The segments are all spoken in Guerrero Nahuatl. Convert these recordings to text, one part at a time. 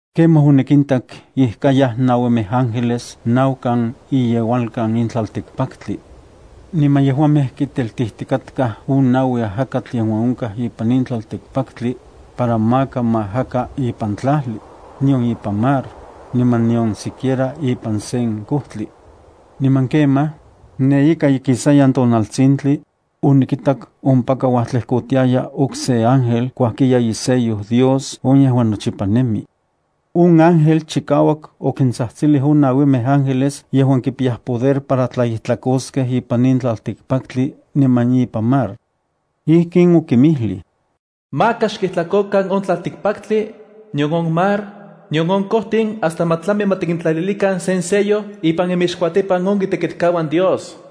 Kemaj onikintak ijkayaj nauimej ángeles naukan iyeualkan in tlaltikpaktli. Niman yejuamej kiteltijtikatkaj on naui ajakatl yejuan onkaj ipan in tlaltikpaktli, para maka ma ajaka ipan tlajli, nion ipan mar, niman nion siquiera ipan sen kojtli. Niman kemaj, ne ika ikisayan tonaltsintli, onikitak ompaka uajtlejkotiaya okse ángel kuajkiya isello Dios on yejuan nochipa nemi. On ángel chikauak okintsajtsilij on nauimej ángeles yejuan kipiyaj poder para tlaijtlakoskej ipan in tlaltikpaktli niman ipan mar. Ijkin okinmijlij: “Maka xkijtlakokan on tlaltikpaktli, nion on mar, nion on kojtin hasta ma tlami ma tikintlalilikan sen sello ipan inmixkuatipan on itekitkauan Dios.”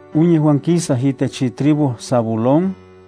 on yejuan kisaj itech itribu Zabulón,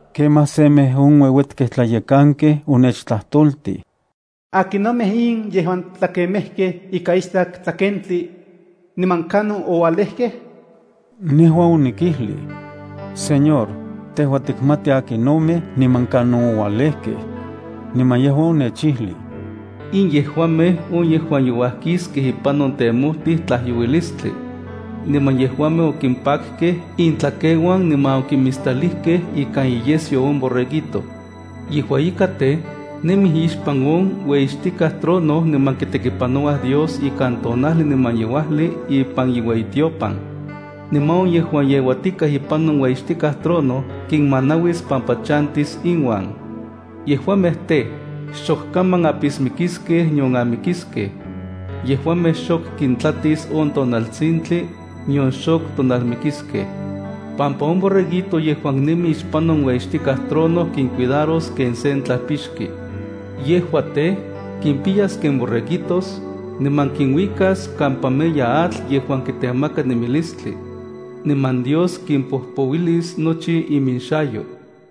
Kemaj semej on ueuetkej tlayekankej onechtlajtoltij: “¿Akinomej in yejuan tlakemejkej ikan istak tlakentli? niman ¿Kanon oualejkej?” Nejua onikijlij: “Señor, tejua tikmati akinomej niman kanon oualejkej.” Niman yejua onechijlij: “In yejuamej on yejuan youajkiskej ipan on temojtij tlajyouilistli. Niman yejuamej okimpakkej intlakeuan niman okimistalijkej ikan iyesyo on Borreguito. Yejua ika tej, nemij ixpan on ueyixtikaj trono niman kitekipanouaj Dios ikan tonajli niman yeuajli ipan iueyitiopan. Niman on yejuan yeuatikaj ipan on ueyixtikaj trono kinmanauis pampa chantis inuan. Yejuamej tej, xok kaman apismikiskej nion amikiskej. Yejuamej xok kintlatis on tonaltsintli, nion xok tonalmikiskej, pampa on Borreguito yejuan nemi ixpan on ueyixtikaj trono kincuidaros ken sen tlajpixki. Yejua tej, kimpiyas ken borreguitos, niman kinuikas kampa meya atl yejuan kitemaka nemilistli. Niman Dios kimpojpouilis nochi inmixayo.”